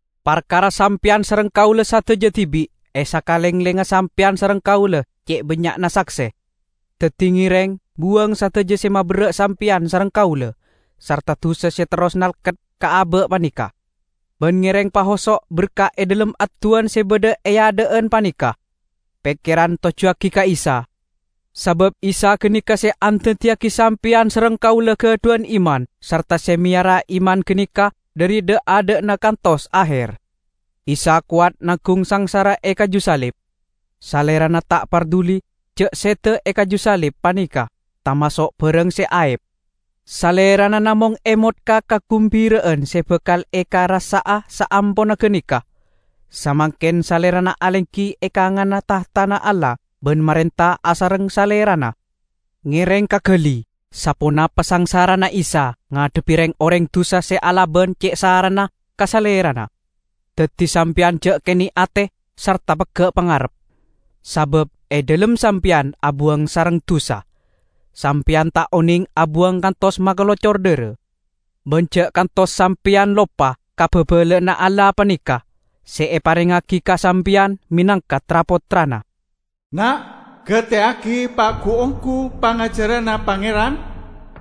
Parkara sampeyan sareng kaula sadaja dibi', e sakalenglengnga sampeyan sareng kaula ce' bannya'na sakse! Daddi ngereng buwang sadaja se maberra' sampeyan sareng kaula, sarta dusa se terros nalket ka aba' paneka. Ban ngereng pahoso' berka' e dhalem adduwan se badha e adha'an paneka. Pekkeran tojjuwagi ka Isa, sabab Isa ganeka se andaddiyagi sampeyan sareng kaula gadhuwan iman sarta se meyara iman ganeka dhari dha'-adha'na kantos aher. Isa kowat nanggung sangsara e kaju salib! Salerana ta' parduli ja' seda e kaju salib paneka tamaso' barang se aeb. Salerana namong emot ka kagumbira'an se bakal ekarassa'a saamponna ganeka. Samangken Salerana alenggi e kanganna tahtana Allah ban marenta asareng Salerana. Ngereng kagali, saponapa sangsarana Isa ngadhebbi reng-oreng dusa se alaban ce' sarana ka Salerana! Daddi Sampeyan ja' kene' ate sarta pegga' pangarep. Sabab e dhalem sampeyan abuwang sareng dusa, sampeyan ta' oneng abuwang kantos mangalocor dhara. Ban ja' kantos sampeyan loppa ka babala'anna Allah paneka, se eparengngagi ka sampeyan menangka tra-pottrana: "Na', gateyagi pagu-onggu pangajaranna Pangeran,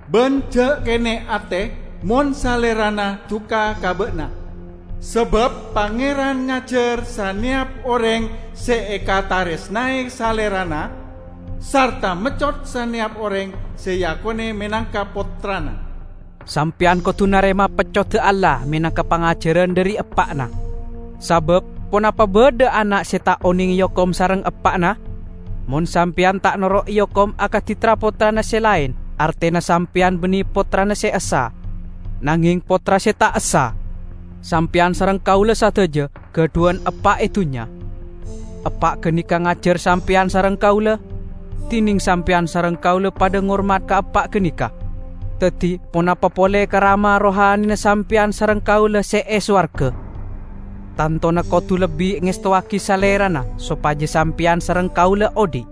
ban ja' kene' ate mon Salerana duka ka ba'na. Sabab Pangeran ngajar saneyap oreng se ekataresnae Salerana, sarta meccot saneyap oreng se eakone menangka pottrana." Sampeyan kodu narema peccodda Allah menangka pangajaran dhari eppa'na. Sabab ponapa badha ana' se ta' oneng eokom sareng eppa'na? Mon sampeyan ta' noro' eokom akadi tra-pottrana se laen artena sampeyan banne pottrana se essa, nangeng pottra se ta' essa. Sampeyan sareng kaula sadaja gadhuwan eppa' e dunnya. Eppa' ganeka ngajar sampeyan sareng kaula, dineng sampeyan sareng kaula padha ngormat ka eppa' ganeka. Daddi, ponapa pole ka Rama rohanina sampeyan sareng kaula se e sowarga, tantona kodu lebbi ngestowagi Salerana sopaja sampeyan sareng kaula odhi'.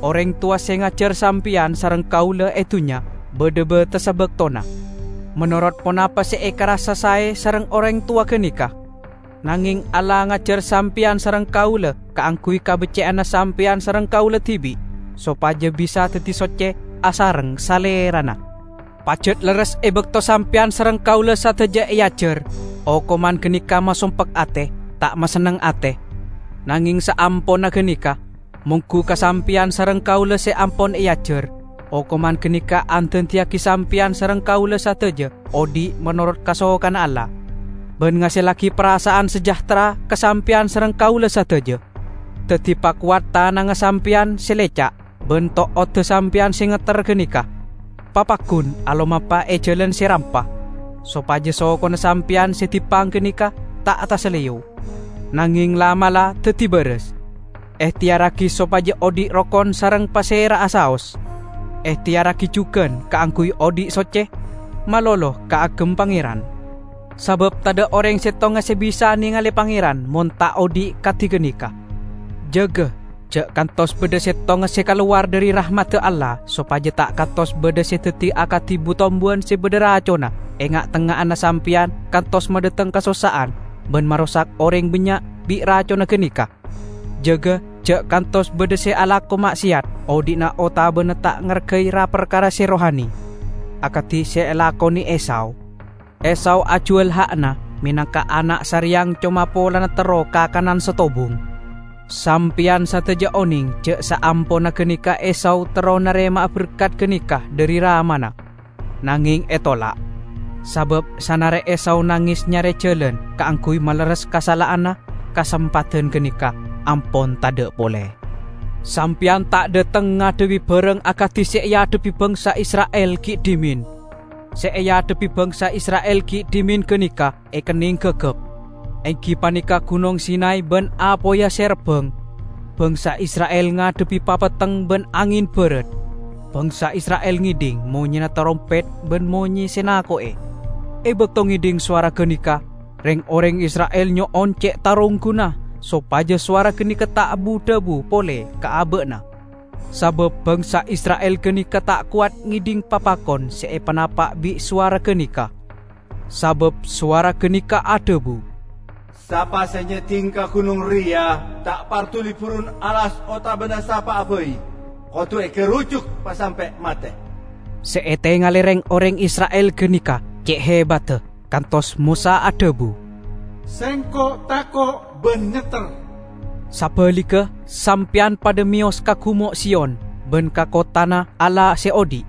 Oreng towa se ngajar sampeyan sareng kaula e dunnya badha batessa baktona, menorot ponapa se ekarassa sae sareng oreng towa ganeka. Nangeng Allah ngajar sampeyan sareng kaula kaangguy kabecce'anna sampeyan sareng kaula dibi', sopaja bisa daddi socce asareng Salerana. Pajat lerres e bakto sampeyan sareng kaula sadaja eajar, okoman ganeka masompek ate, ta' masenneng ate. Nangeng saamponna ganeka, monggu ka sampeyan sareng kaula se ampon eajar, okoman ganeka andaddiyagi sampeyan sareng kaula sadaja odhi' menorot kasokanna Allah, ban ngasellagi parasa'an sejahtera ka sampeyan sareng kaula sadaja. Daddi pakowat tanangnga sampeyan se leca' ban to'odda sampeyan se ngetter ganeka! Papaggun alomampa e jalan se rampa, sopaja sokona sampeyan se dippang ganeka ta' tasaleyo, nangeng la'-mala' daddi baras. Ehteyarragi sopaja odhi' rokon sareng pasera'a saos. Ehteyarragi jugan kaangguy odhi' socce, malolo kaagem Pangeran. Sabab tadha' oreng settonga se bisa nengale Pangeran mon ta' odhi' kadi ganeka. Jaga ja' kantos badha settonga se kalowar dhari rahmadda Allah sopaja ta' kantos badha se daddi akadi bu-tombuwan se badha raconna e nga'-tengnga'anna sampeyan kantos madhateng kasossa'an ban marosak oreng bannya' bi' raconna ganeka. Jaga ja' kantos badha se alako ma'seyat odhi'na otabana ta' ngargai ra-parkara se rohani, akadi se elakone Esau. Esau ajuwal ha'na menangka ana' sareyang coma polana terro kakanan satobung. Sampeyan sadaja oneng ja' saamponna ganeka Esau terro narema'a berkat ganeka dhari ramana, nangeng etolak. Sabab sanare Esau nanges nyare jalan kaangguy malerres kasala'anna, kasempadan ganeka ampon tadha' pole. Sampeyan ta' dhateng ngadhebbi barang akadi se eadhebbi bangsa Isra'il gi' dhimen. Se eadhebbi bangsa Isra'il gi' dhimen ganeka ekenneng gagap, enggi paneka Gunong Sinay ban apoyya se rabbang; bangsa Isra'il ngadhebbi papetteng ban angen barat; bangsa Isra'il ngedhing monyena tarompet ban monye se nako'e. E bakto ngedhing sowara ganeka, reng-oreng Isra'il nyo'on ce' tarongguna sopaja sowara ganeka ta' abu-dhabu pole ka aba'na. Sabab bangsa Isra'il ganeka ta' kowat ngedhing papakon se epanapa' bi' sowara ganeka. Sabab sowara ganeka adhabu, "Sapa se nyedding ka gunong reya, ta' parduli burun alas otabana sapa'a bai, kodu egarujuk pasampe' mate." Se etengale reng-oreng Isra'il ganeka ce' hebadda kantos Mosa adhabu, "Sengko' tako' ban ngetter!" Sabaligga sampeyan padha meyos ka Gumo' Siyon ban ka kotthana Allah se odhi',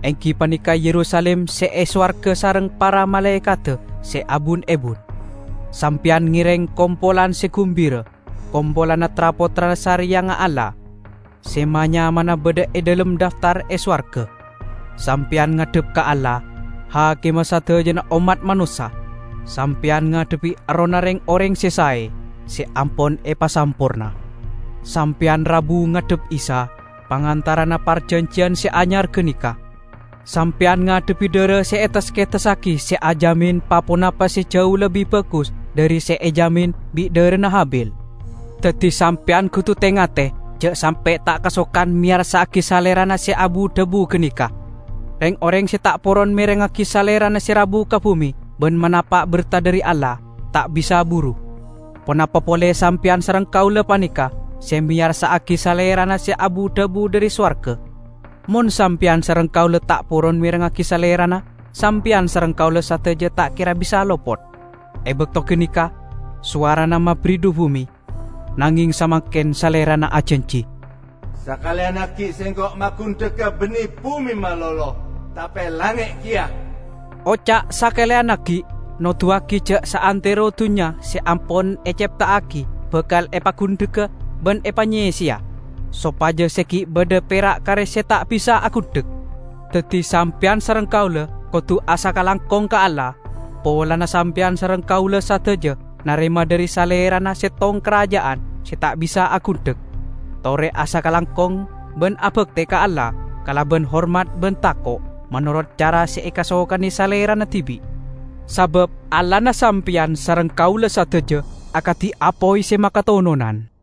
enggi paneka Yerusalim se e sowarga sareng para malaekadda se abun-ebun. Sampeyan ngereng kompolan se gumbira -- kompolanna tra-pottra sareyangnga Allah, se ma-nyamana badha e dhalem dhaftar e sowarga. Sampeyan ngadhep ka Allah, Hakimma sadajana ommat manossa. Sampeyan ngadhebbi errohna reng-oreng se sae, se ampon epasamporna. Sampeyan rabu ngadhep Isa, Pangantarana parjanjiyan se anyar ganeka; sampeyan ngadhebbi dhara se etes-ketessagi se ajamin pa-ponapa se jau lebbi bagus dhari se ejamin bi' dharana Habil. Daddi, sampeyan kodu te-ngate, ja' sampe' ta' kasokan meyarsa'agi Salerana se abu-dhabu ganeka. Reng-oreng se ta' poron merengngagi Salerana se rabu ka bume ban manapa' berta dhari Allah, ta' bisa buru. Ponapa pole sampeyan sareng kaula paneka se meyarsa'agi Salerana se abu-dhabu dhari sowarga! Mon sampeyan sareng kaula ta' poron merengngagi Salerana, sampeyan sareng kaula sadaja ta' kera bisa lopot! E bakto ganeka sowarana mabaridhu bume. Nangeng samangken Salerana ajanji, "Sakaleyan aggi' Sengko' magundhegga banne bume malolo, tape langnge' keya." Oca' "sakaleyan aggi'" noduwagi ja' saantero dunnya se ampon ecepta'agi bakal epagundhegga ban epanyeseya, sopaja se gi' badha pera' kare se ta' bisa agundhek. Daddi, sampeyan sareng kaula kodu asakalangkong ka Allah, polana sampeyan sareng kaula sadaja narema dhari Salerana settong karaja'an se ta' bisa agundhek. Tore asakalangkong ban abakte ka Allah kalaban hormat ban tako', menorot cara se ekasokane Salerana dibi'. Sabab Allahna sampeyan sareng kaula sadaja akadi apoy se makatononan.